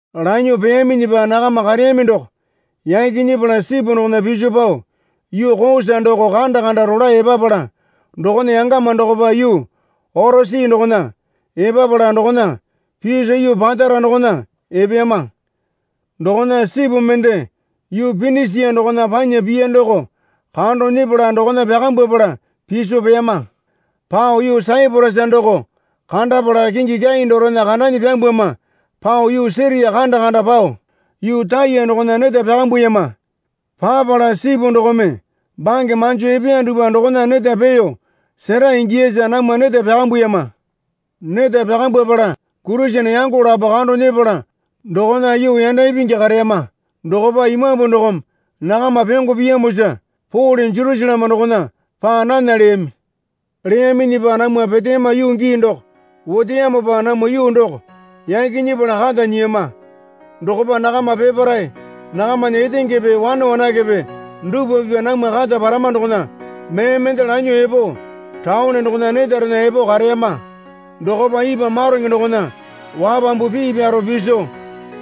Lanyuo peyaminyipa nakama kareyami doko yaki nyepala sipu dokona piso pao yuu Kosa doko kanda kanda rolae epapala dokona yangama dokopa yuu Orosi dokona epapala dokona piso yuu Patara dokona epeyama. Dokona sipu mende yuu Pinisia dokona panya piya doko kando nyepala dokona pyakambwapala piso peyama. Pao yuu Saiporasa doko kandapala kingi kyai dorena kandanyi pyambwama pao yuu Siria kanda kanda pao yuu Taya dokona neta pyakambuyama. Papala sipu dokome bange manjo epeya dupwa dokona neta peeyo sera ingiyasa namwa neta pyakambuyama. Neta pyakambwapala Kurisene yango lapo kando nyepala dokona yuu yanda ipingi kareyama. Dokopa Imambu dokome nakama pyongo piyamosa Pole Jerusaleme dokona paa nana leyami. Leyaminyipa namwa peteyama yuu gii doko oteyamopa namwa yuu doko yaki nyepala kata nyiyama. Dokopa nakama peparae nakamana etengepe wane wanakepe dupwa pipya namwa kata parama dokona mee mende lanyuo epo taone dokona netarena epo kareyama. Dokopa ipwa maronge dokona wapambu pii pyaro piso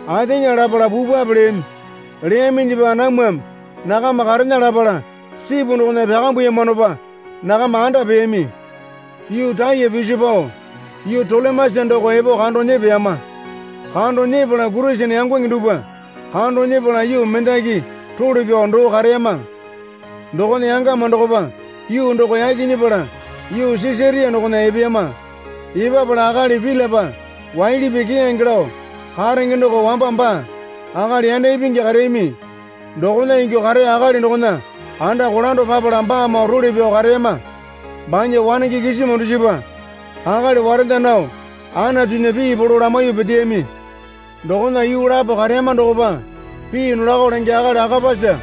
ateŋa lapala pupwape leyami. Leyaminyipa namwame nakama karena lapala sipu dokona pyakambuyamanopa nakama anda peyami. Yuu Taya piso pao yuu Tolemesa doko epo kando nyepeyama. Kando nyepala Kurisene yangonge dupwa kando nyepala yuu mendaki role pyao doo kareyama. Dokona yangama dokopa yuu doko yaki nyepala yuu Sisaria dokona epeyama. Epapala akali Pilipa waili pii keyange lao karenge doko wamba baa akali yanda ipingi kareyami dokona ingyuo kareya akali dokona anda kolando papala baamoo role pyao kareyama. Banya wanenge kisima dusipa akali warenda nao Anatunya pii polo lamaiyuo peteyami. Dokona yuu lapo kareyama dokopa pii nolako lenge akali Akapasa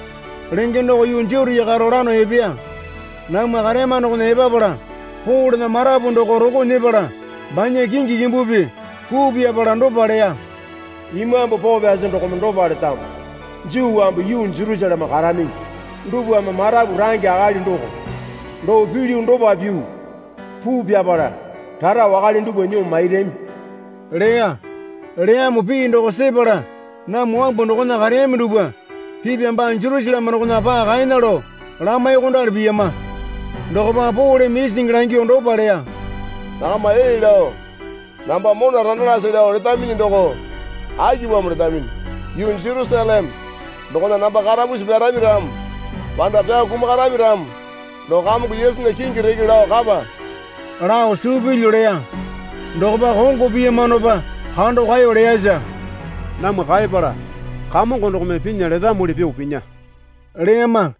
lenge doko yuu Jutia karo lano epeya. Namwa kareyama dokona epapala Polena marapu doko rolo nyepala banya kingi kimbupi puu pyapala dopa leya. Imambu Poo Pyasi dokome dopa letamo. Juu wambu yuu Jerusaleme karaminyi dupwame marapu range akali doko doo pilyu dopa pyuo puu pyapala rara wakale dupwa nyuo mairami leya. Leyamo pii doko sepala namwa wambu dokona kareyami dupwa pipya baa Jerusaleme dokona paa kaena lao lamaiyuokondali piyama. Dokopa Poleme isingi langyuo dopa leya. Nakama ee lao namba mona randalase lao letaminyi doko akipamo letaminyi? Yuu Jerusaleme dokona namba karapusi pyarami ramo panda pyao kumakarami ramo doko Kamongo Yesunya kingi reke lao kapa lao suu pilyu leya. Dokopa kongo piyamanopa kando kaeyo leyasa namwa kaepala Kamongo dokome pinya letamuli pyuo pinya leyama.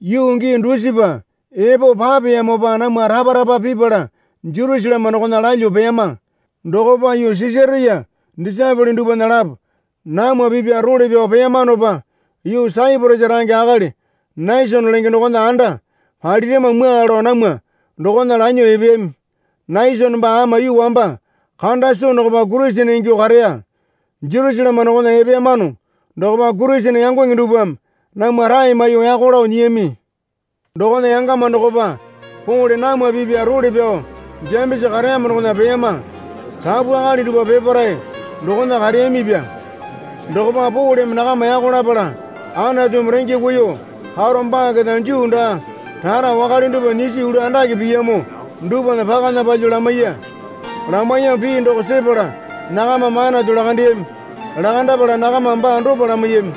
Yuu gii dusipa epo papeyamopa namwa rapa rapa pipala Jerusaleme dokona lalyuo peyama. Dokopa yuu Sisaria disaepole dupwana lapo namwa pipya role pyao peyamanopa yuu Saiporasa range akali Nesone lenge dokona anda palirama mwua lao namwa dokona lanyuo epeyami. Nesone baa ama yuu wamba kanda soo dokopa Kurisene ingyuo kareya. Jerusaleme dokona epeyamano dokopa Kurisene yangonge dupwame namwa rae maiyuo yako lao nyiyami. Dokona yangama dokopa Pole namwa pipya role pyao Jemesa kareyamo dokona peyama. Rapu akali dupwa peparae dokona kareyamipya. Dokopa Poleme nakama yako lapala Anatumi renge kuiyuo karo baa keta Juu daa rara wakale dupwa nyiso yulu andake piyamo dupwana pakana palyuo lamaiya. Lamaiyamo pii doko sepala nakamame Anatu lakandeyami. Lakandapala nakamame baa dopa lamaiyami.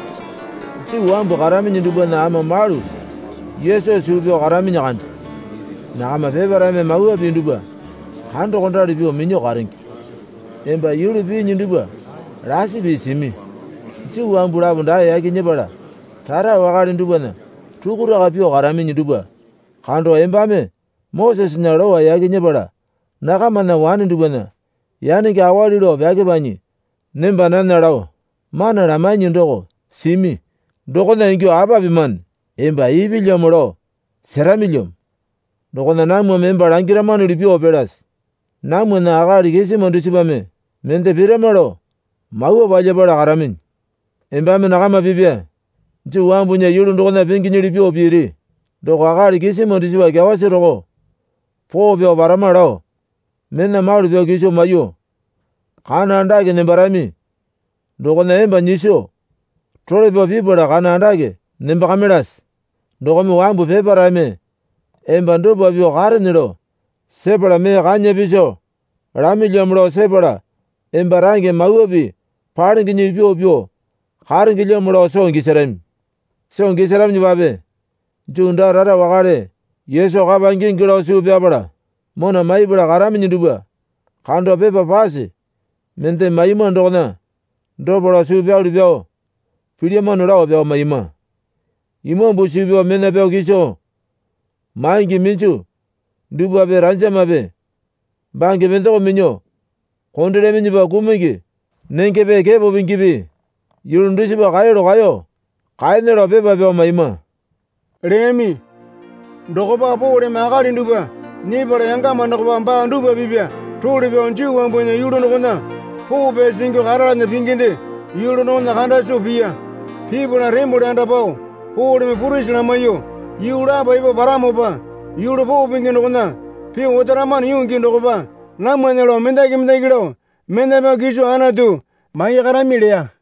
Juu wambu karaminyi dupwana ama malu Yesu suu pyao karaminyi kande. Nakama peparaeme Mawa Pii dupwa kandokondali pyuo minyuo karenge. Emba yulu piinyi dupwa lasi pii simi. Juu wambu lapo dae yaki nyepala rara wakale dupwana rukuraka pyuo karaminyi dupwa kando embame Mosesena Lowa yaki nyepala nakamana wane dupwana yanenge awali lao pyakepanyi nemba nana lao mana lamainyi doko simi. Dokona ingyuo apa pimane? Emba ipilyamo lao seramilyamo. Dokona namwame emba langiramanuli pyuo pilase. Namwana akali kisima dusipame mende pirama lao mawa palyapala karaminyi. Embame nakama pipa Juu wambunya yulu dokona pinginyili pyuo piri. Doko akali kisima dusipa kyawasi roko poo pyao parama lao mena malu pyao kiso maiyuo kana andake nembarami dokona emba nyiso role pyao pipala kana andake nembakamaiyalase. Dokome wambu peparaeme emba dopa pyuo karene lao sepala mee kanya piso lamilyamo lao sepala emba range Mawa Pii palengenyili pyuo pyuo karengelamo lao soo gisarami. Soo gisaraminyipape Juu daa rara wakale Yesu kapa ingingi lao suu pyapala mona maipala karaminyi dupwa kando pepa pase mende maiyama dokona dopa lao suu pyalu pyao pilyamano lao pyao maiyama. Imambu suu pyao mena pyao kiso maingi minju dupwape ranjamape bange pendoko minyuo kondelyaminyipa kumungi nengepe kepo pingipi yulu dusipa kaeyalu kaeyo kaena lao pepa pyao maiyama, leyami. Dokopa Poleme akali dupwa nyepala yangama dokopa baa dupwa pipa role pyao Juu wambunya yulu dokona poo pyasi ingyuo karalana pinginde yulu dokona kanda soo piya. Pipala tembole anda pao Poleme purisi lamaiyuo yuu lapo epo paramopa yulu poo pingi dokona pyuo otaramano yuu gii dokopa namwana lao mendaki mendaki lao mena pyao kiso Anatu maiyakarami leya.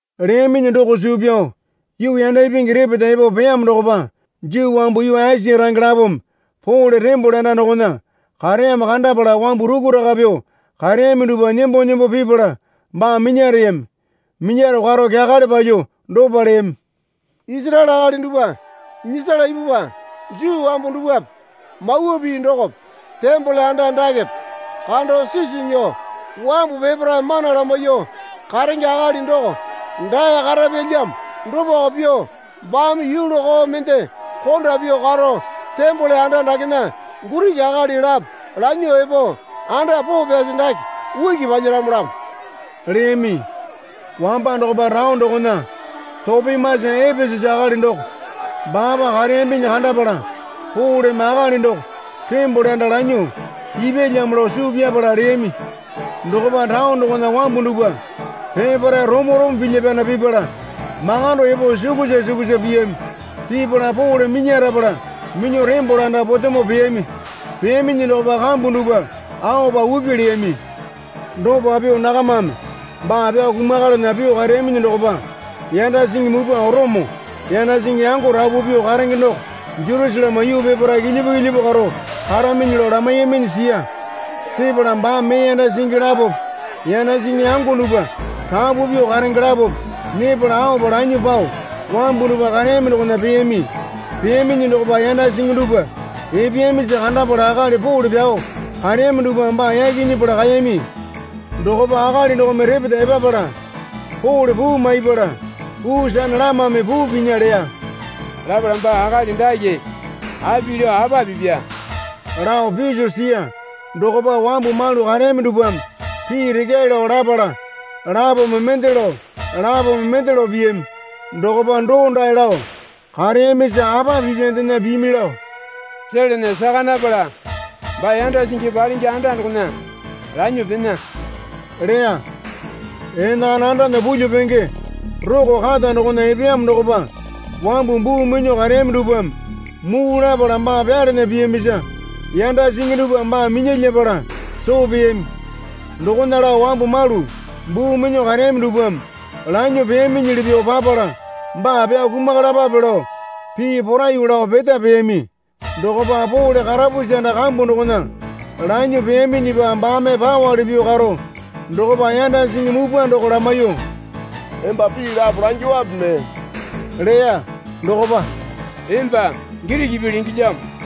Leyaminyi doko suu pyao yuu yanda ipingi repeta epo peyamo dokopa Juu wambu yuu Esia range lapome Pole tembole anda dokona kareyamo kandapala wambu rukuraka pyuo kareyami dupwa nembo nembo pipala baa minyareyami. Minyaro karo kyakale palyuo dopa leyami. Isaraele akali dupwa, nyisala ipupwa. Juu wambu dupwape Mawa Pii dokope tembole anda dakepe kando sisu nyuo wambu peparae mana lamaiyuo karenge akali doko dae karapyalyamo. Dopako pyuo baame yulu koo mende konda pyuo karo, tembole anda dakena Giriki akali lapo lanyuo epo anda poo pyasi dake uki palyalamolamo leyami. Wamba dokopa taone dokona Topimasa Epesasa akali doko baapa kareyambinyi kandapala Poleme akali doko tembole anda lanyuo ipyalamo lao suu pyapala leyami. Dokopa taone dokona wambu dupwa peparae romo romo pilya pyana pipala makando epo sukusa sukusa piyami. Pipala Pole minyarapala minyuo tembole anda potemo peyami. Peyaminyi dokopa kambu dupwa aopa upi leyami. Dopa pyuo nakamame baa pyao kumakalana pyuo kareyaminyi dokopa yanda singi mupwa Orome yanda singi yango rapu pyuo karenge doko Jerusaleme yuu peparae kilyipu kilyipu karo karaminyi lao lamaiyaminyi siya. Sepala baame mee yanda singi lapope yanda singi yango dupwa rapu pyuo karenge lapope nyepala aopa lanyuo pao wambu dupwa kareyami dokona peyami. Peyaminyi dokopa yanda singi dupwa epeyamisa kandapala akali Pole pyao kareyami dupwame baa yaki nyepala kaeyami. Dokopa akali dokome repeta epapala Pole puu maipala puu sane lamame puu pinya leya. Lapala baa akali dake api lao apa pipya lao piso siya. Dokopa wambu malu kareyami dupwame pii rekyae lao lapala lapome mende lao lapome mende lao piyami. Dokopa doondae lao kareyamisa apa pipyandena pimi lao selana saka napala baa yanda singi palenge anda dokona lanyuo pena leya. Enakana andana pulyuo penge roko kata dokona epeyamo dokopa wambu buu minyuo kareyami dupwame muu lapala baa pyalana piyamisa yanda singi dupwame baa minyalyapala soo peyami. Dokona lao wambu malu buu minyuo kareyami dupwame lanyuo peyaminyili pyuo papala, baa pyao kumakalapape lao pii poraiyuo lao peta peyami. Dokopa Pole karapusi anda kambu dokona lanyuo peyaminyipa baame pawali pyuo karo dokopa yanda singi mupwa doko lamaiyuo, Emba pii lapo langyuowape mee? leya. Dokopa, Emba Giriki pii lengelyamo.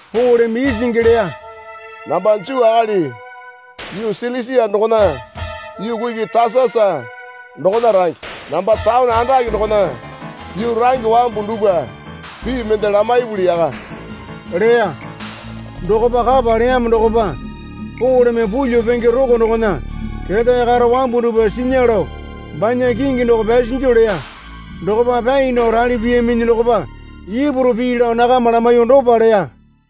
Poleme isingi leya, Namba Juu akali yuu Silisia dokona yuu kuki Tasasa dokona range. Namba taone andake dokona yuu range. Wambu dupwa pii mende lamaipuli yaka leya. Dokopa kapa leyamo dokopa Poleme pulyuo penge roko dokona ketae karo wambu dupwa sinya lao banya kingi doko pyasinju leya. Dokopa pyai nao rali piyaminyi dokopa Ipuru pii lao nakama lamaiyuo dopa leya.